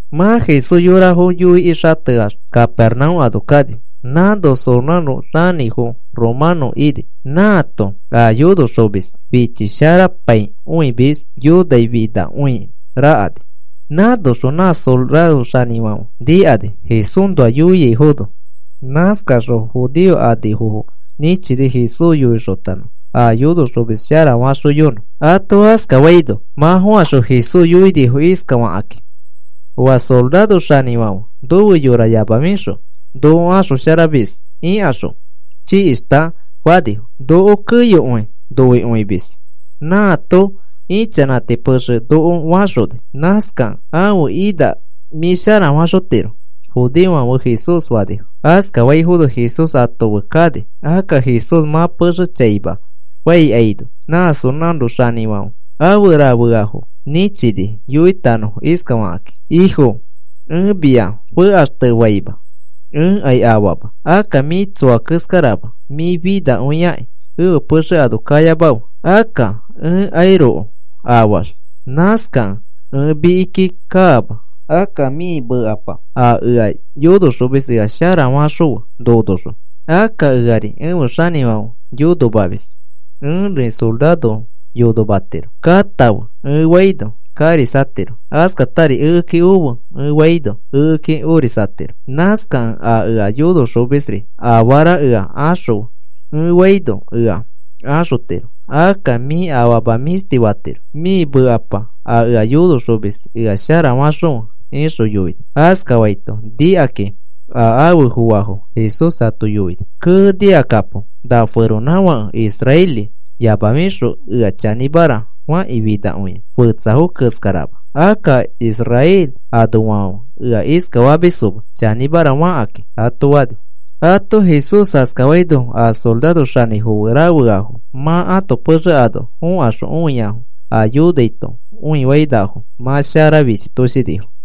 Mã Jesús yorafo yoikĩ xateax Capernaúm ano kani. Nãno soraro xanĩfo romanõ ini. Nãato a yonoxomis fichisharapaikõimis yonaifinakõi nakerani. Nãnoxõ nã soraro xanĩfãfe nikani Jesúsnoa yoaifono. Nãskaxõ judeo anifofo nĩchini Jesús yoixotanõfo a yonoxomis sharafaxoyonõ. Ato askafaino mã fokaxõ Jesús yoinifo iskafakakĩ: “Oa soraro xanĩfãfe nofe yora yamafixõ noko axosharamis ikaxõ chikishta,” fanifo. “Noko keyokõi noikõimis nãato ichanãti pexe noko faxoni. Nãskakẽ ãfe ina mĩ sharafaxotiro,” judeofãfe Jesús fanifo. Askafaifono Jesús ato fe kani. Akka Jesús mã pexe chaima faikaino, nã soraro xanĩfãfe afe rafeafo nĩchini yoitanõfo iskafakĩ: “Ifo, ẽ mia fekaxtefaima. Ẽkai afaama. Akka mĩ tsoa keskarama. Mĩ finakõiakĩ ẽfe pexe ano kayamafe. Akka ẽkairoko afaax nãskakẽ ẽ mikiki kaama. Akka mĩ mekapa a ea yonoxomis ea sharafaxõfe nonoxõ. Akka eari ẽfe xanĩfãfe yonomamis. Ẽri sorafofo yonomatiro. ‘Katãfe,’ ẽ faino karisatiro. Askatari, ‘Ekeki ofe,’ ẽ faino ekeki orisatiro. Nãskakẽ a ea yonoxomisri afara ea axõfe ẽ faino ea axotiro. Akka mĩ afama mĩshti fatirokĩ. Mĩ mekapa a ea yonoxomis ea sharafaxõfe,” ixõ yoini. Askafaito nikakĩ a afe foafo Jesús ato yoini: “Kee, nikakapo. Na feronãfake israeli yamafixõ ea chanĩmara fakĩ finakõi, fetsafo keskarama. Akka Israel anoafãfe ea iskafamisfoma chanĩmara fakakĩ,” ato fani. Ato Jesús askafaino a sororo xanĩfo fe rafeafo mã ãto pexe ano fokaxõ õiafo a yonaito õifainafo mã shara fichitoshinifo.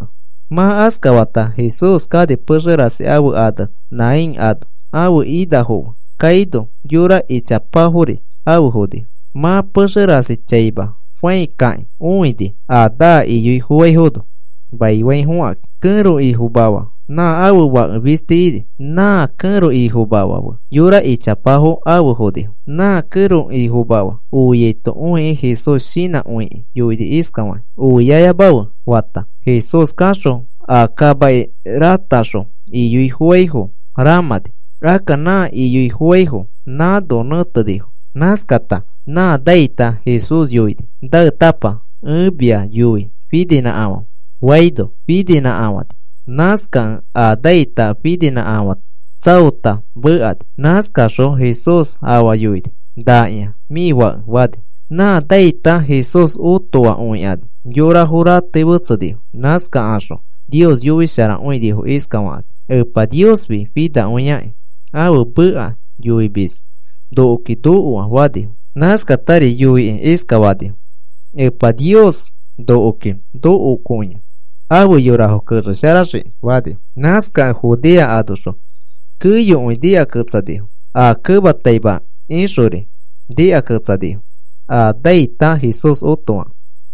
Mã askafata Jesús kani pexe rasi ãfe ane Nain ano. Ãfe inafo fe kaino yora ichapafori afe fonifo. Mã pexe rasi chaima fãi kakĩ õini a naa iyoifofaifono maifaifokakĩ. Kẽro ifomafa nã ãfe fake fisti ini. Nã kẽro ifomafa fe yora ichapafo afe fonifo. Nã kẽro ifomafa oiaito õikĩ, Jesús shinãkõikĩ yoini iskafakĩ: “Oiayamafe,” fata, Jesús kaxõ a kamaki rataxõ iyoi foaifo ramãni. Akka nã iyoi foaifo nãno nẽtenifo. Nãskata nã naita Jesús yoini: “Naetapa, ẽ mia yoi, fininĩkafãfe,” faino, fininĩkafãni. Nãskakẽ a naita fininãkafã tsaota mekani. Nãskaxõ Jesús afa yoini: “Nakĩa, mĩ fake,” fani. Nã naita Jesús otoa õikani. Yorafo ratei fetsenifo. Nãskakaxõ Nios yoisharakõinifo iskafakakĩ: “Epa Niosfi finakõiakĩ ãfe meka yoimis nokoki nokoa,” fanifo. Nãskatari yoikĩ iskafanifo: “Epa Nios nokoki nokokõia, afe yorafo kexesharaxiki,” fanifo. Nãskakẽ Judea anoxõ keyokõi nikaketsanifo, aa kematai ixori nikaketsanifo a naita Jesús otofakẽ.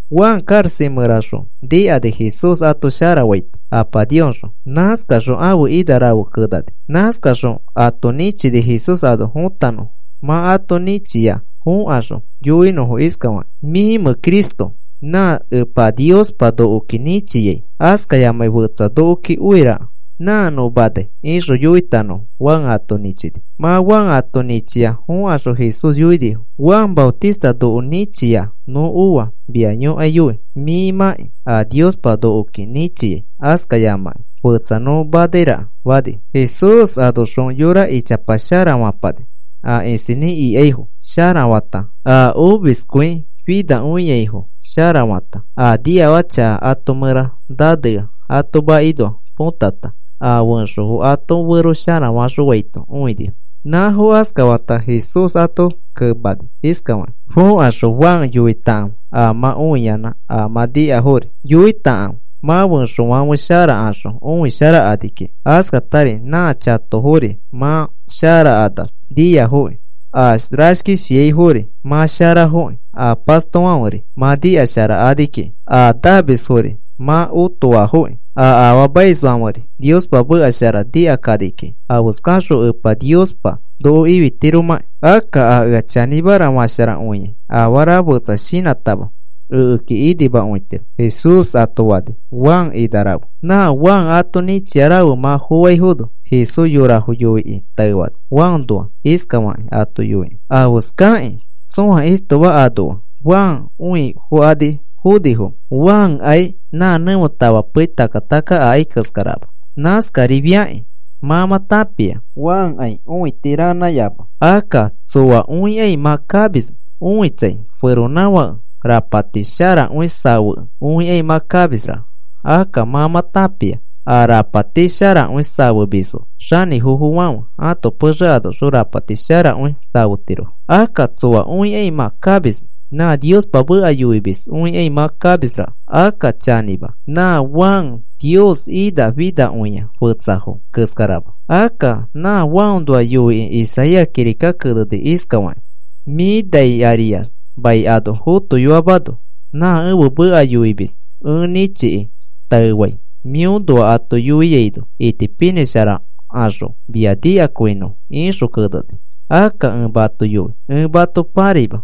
Juan karaxa mẽraxõ nikani Jesús ato sharafaito Apa Niosxõ. Nãskaxõ ãfe ina rafe kenani. Nãskaxõ ato nĩchini Jesús ano fotanõfo mã ato nĩchia fokaxõ yoinõfo iskafakĩ: “¿Mĩmẽ Cristo nã Epa Niospa nokoki nĩchiai, askayamai fetsa nokoki oiraka nã nõ manai?” ixõ yoitanõfo Juan ato nĩchini. Mã Juan ato nĩchia fokaxõ Jesús yoinifo: “Juan Maotista noko nĩchia nõ oa mia yõkaiyoi, mĩmakĩ a Niospa nokoki nĩchia, askayamakĩ fetsa nõ manairaka,” fanifo. Jesús anoxõ yora ichapa sharafapani, a isinĩ ikanaifo sharafata, a omiskõifinakõiafo sharafata, a niafaka chaka ato mẽra nanea ato makinoa potata, a fẽxofo ato fero sharafaxõaito õinifo. Nãfo askafata Jesús ato kemani iskafakĩ: “Fokaxõ Juan yoitakãfe a mã õiyanã a mã nikafori. Yoitakãfe, mã fẽxofãfe sharakaxõ õisharakani kiki, askatari nã chatofori mã sharakanax niafoki, a rashkishiaifori mã sharafokĩ, a pastofãferi mã nikasharakani kiki, a namisfori mã otoafoki, a afaamaisfãferi Niospa meka shara nikakani kiki afeskaxõ Epa Niospa noko ifitiromakĩ. Akka a ea chanĩmara fasharakõia afara fetsa shinãtama ekeki inimakõitiro,” Jesús ato fani, Juan ina rafe. Nã Juan ato nĩchia rafe mã foaifono Jesús yorafo yoikĩ taefani Juanoa, iskafakĩ ato yoikĩ: “¿Afeskakĩ tsõa istoma anoa Juan õifokani fonifomẽ? Juankai nã nẽfe tafa pei takka takka akai keskarama. Nãskarifiakĩ mã mã tãpia Juankai õiti ranãyama. Akka, ¿tsoa õikai mã kamismẽ? Õitsai, feronãfake rapati sharakõi safekẽ õikai mã kamisraka. Akka mã mã tãpia a rapati sharakõi safemisfo xanĩfofofãfe ãto pexe anoxõ rapati sharakõi safetirofo. Akka, ¿tsoa õikai mã kamismẽ? Nã Niospa meka yoimis õikai mã kamisraka. Akka chanĩma, nã Juan Niospa ina finakõia fetsafo keskarama. Akka nã Juanoa yoikĩ Isaías kirika keneni iskafakĩ: Mĩ nai ariax mai ano fotoyoamano nã ẽfe meka yoimis ẽ nĩchiki taefai mĩõnoa ato yoiaino itipinĩsharakaxõ mia nikakõinõfo, ixõ keneni. Akka ẽ mato yoi, ẽ mato pãraima.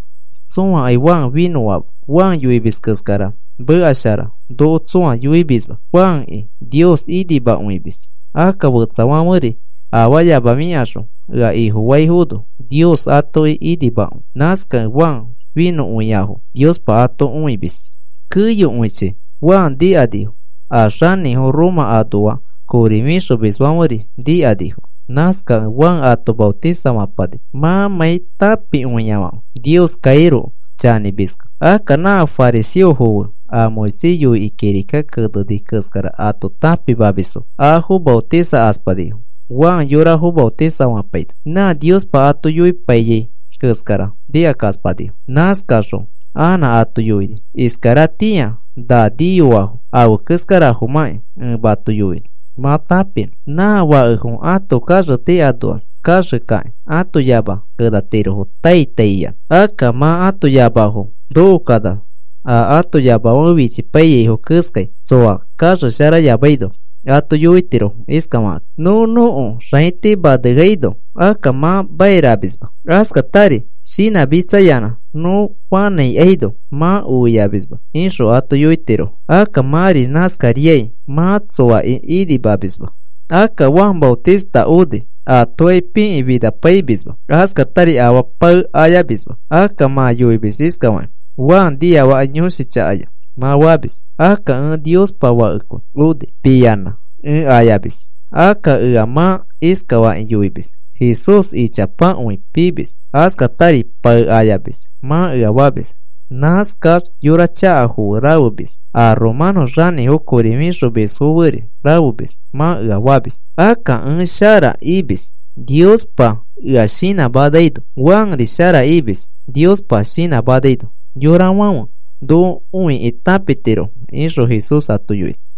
Tsõakai Juan finõama. Juan yoimis keskara meka shara noko tsõa yoimisma. Juanki Nios inimakõimis. Akka fetsafãferi afayamafikaxõ ea Ifofaifono Nios atoki inimakõi. Nãskakẽ Juan finõkõiafo Niospa ato õimis.” Keyokõichi Juan nikanifo, a xanĩfo Roma anoa kori fixomisfãferi nikanifo. Nãskakẽ Juan ato maotisafapani mãmãi tãpikõiafãfe Nioskairoko chanĩmiskẽ. Akka nã fariseofo fe a Moisés yoikĩ kirika keneni keskara ato tãpimamisfo afo maotisakaspanifo Juan yorafo maotisafapaino. Nã Niospa ato yoipaiyai keskara nikakaspanifo. Nãskaxõ anã ato yoini: “Iskaratĩa na niyoafo afe keskarafomãkĩ ẽ mato yoinõ mã tãpinõ. Nã fakefo ãto kaxeti anoax kaxekakĩ ãto yamafo kenatirofo tai tai iyanã. Akka mã ãto yamafo nokokanax a ato yamafãfe fichipaiyaifo keskai tsoa kaxesharayamaino ato yoitirofo iskafakakĩ: ‘Nõ nõko xaiti maneaino akka mã mairamisma. Askatari shinãmitsayanã nõ fanãikaino mã oiamisma,’ ixõ ato yoitirofo. Akka mãri nãskariai mã tsoaki inimamisma. Akka Juan Maotista oni. Atokai pikĩ finapaimisma, askatari afaa pae ayamisma. Akka mã yoimis iskafakĩ: ‘Juan niafaka yõshi chakaya,’ mã famis. Akka ẽ Niospa Fakekõi oni. Piyanã ẽ ayamis. Akka ea mã iskafakĩ yoimis: ‘Jesús ichapakõi piimis, askatari pae ayamis,’ mã ea famis. ‘Nãskax yora chakafo fe rafemis, a romanõ xanĩfo kori fixomisfo feri rafemis,’ mã ea famis. Akka ẽ shara imis Niospa ea shinãmanaino. Juanri shara imis Niospa shinãmanaino. Yorafãfe noko õikĩ tãpitirofo,” ixõ Jesús ato yoini.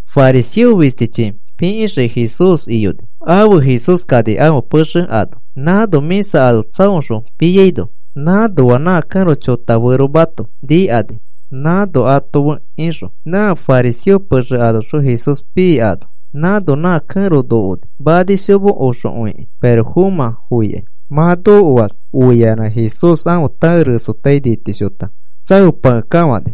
Fariseo fistichi pikĩxiki Jesús iyoni. Afe Jesús kani ãfe pexe ano nãno mĩsa ano tsaoxõ piaino. Nãnoa nã kẽro chotaferomato nikani nãno ato fe ixõ. Nã fariseo pexe anoxõ Jesús pii ano, nãno nã kẽro nokoni, manishomo oxokõiki pirofomã foikai. Mã nokoax oiayanã Jesús ãfe tae resotai nitishota tsaopakekafãni.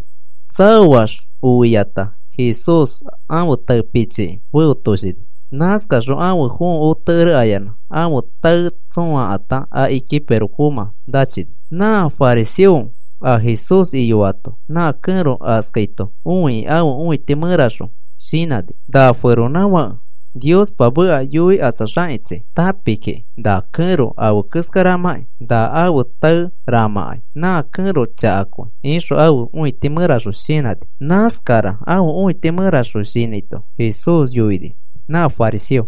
Tsaoax oiaino Jesús ãfe tae pichiki ãfe fẽotoshini. Nãskaxõ ãfe fõo otekere ayanã ãfe tae tsõokakata akiki pirofomã nachini. Nã fariseo a Jesús iyoato na kẽro askaito õikĩ ãfe õiti mẽraxõ shinãni: “Na feronãfake Niospa meka yoikatsaxakitsi tãpi kiki na kẽro afe keskaramakĩ na ãfe tae ramãkai, nã kẽro chakakõi,” ixõ ãfe õiti mẽraxõ shinãni. Nãskara ãfe õiti mẽraxõ shinãito Jesús yoini nã fariseo: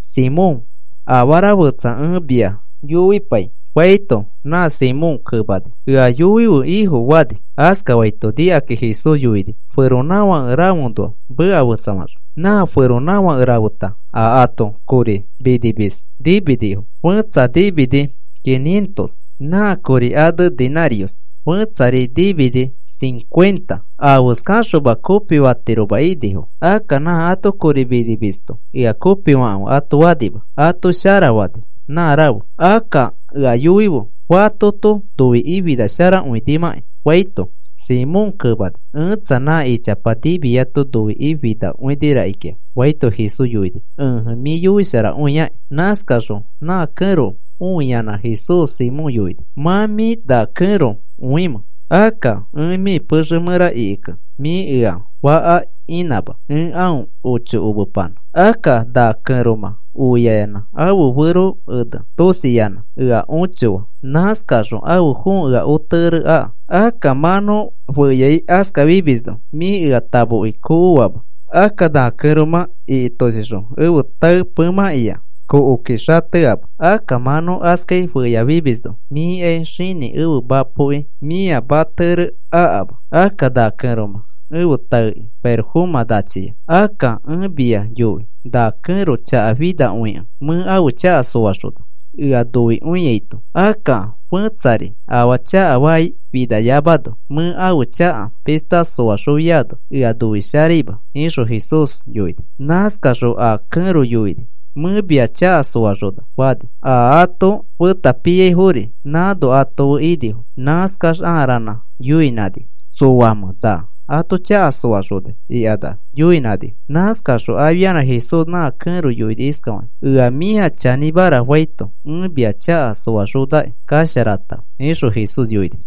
“Simón, afara fetsa ẽ mia yoipai,” faito nã Simón fariseo kemani: “Ea yoife, Ifo,” fani. Askafaito nikakĩ Jesús yoini feronãfake rafeõnoa meka fetsafaxõ: “Nã feronãfake rafeta a ato kori minimis niminifo. Fẽtsa nimini quinientos nã kori ane denarios. Fẽtsari nimini cincuenta. Afeskaxoma kopifatiroma inifo. Akka nã ato kori minimisto ea kopifakãfe ato fanima. Ato shara fani nã rafe. Akka ea yoife fatoto noikĩ finasharakõimãkai,” faito, Simón kemani: “Ẽtsa, nã ichapa nimiato noikĩ finakõi rakikĩa,” faito, Jesús yoini: “Ẽje, mĩ yoisharakõiaki.” Nãskaxõ nã kẽro õiyanã Jesús Simón yoini: “¿Mã mĩ na kẽro õimẽ? Akka ẽ mĩ pexe mẽra ikikẽ mĩ ea faka inãma, ẽ aõ ochokomepanã. Akka na kẽromã oiayanã ẽfe taeki ãfe fẽo tosiyanã ea õchoa. Nãskaxõ ãfe fõo ea otekere aka. Akka mã nõ feyai askafimisno, mĩ ea tamoki tsoo akama. Akka na kẽromã ikitoshixõ ẽfe tae pemãkĩa tsoo akĩ xateama. Akka mã nõ feyai askafimisno mĩkai xinĩ ẽfe mapoki mĩa matekere akama. Akka na kẽromã ẽfe taeki pirofomã nachia. Akka ẽ mia yoi, na kẽro chaka finakõikẽ mẽ ãfe chaka soaxona, ea noikõiaito. Akka fẽtsari afaa chakafai finamano mẽ ãfe chaka pishta soaxofiano ea noisharaima,” ixõ Jesús yoini. Nãskaxõ a kẽro yoini: “Mẽ mia chaka soaxona,” fani. A ato feta piaifori nãno ato fe inifo. Nãskax aa ranã yoinãnifo. “¿Tsoamẽ na ato chaka soaxonai?” ikanax yoinãnifo. Nãskaxõ afianã Jesús nã kẽro yoini iskafakĩ: “Ea mĩa chanĩmara faito ẽ mia chaka soaxonaki, kasharatãfe,” ixõ Jesús yoini.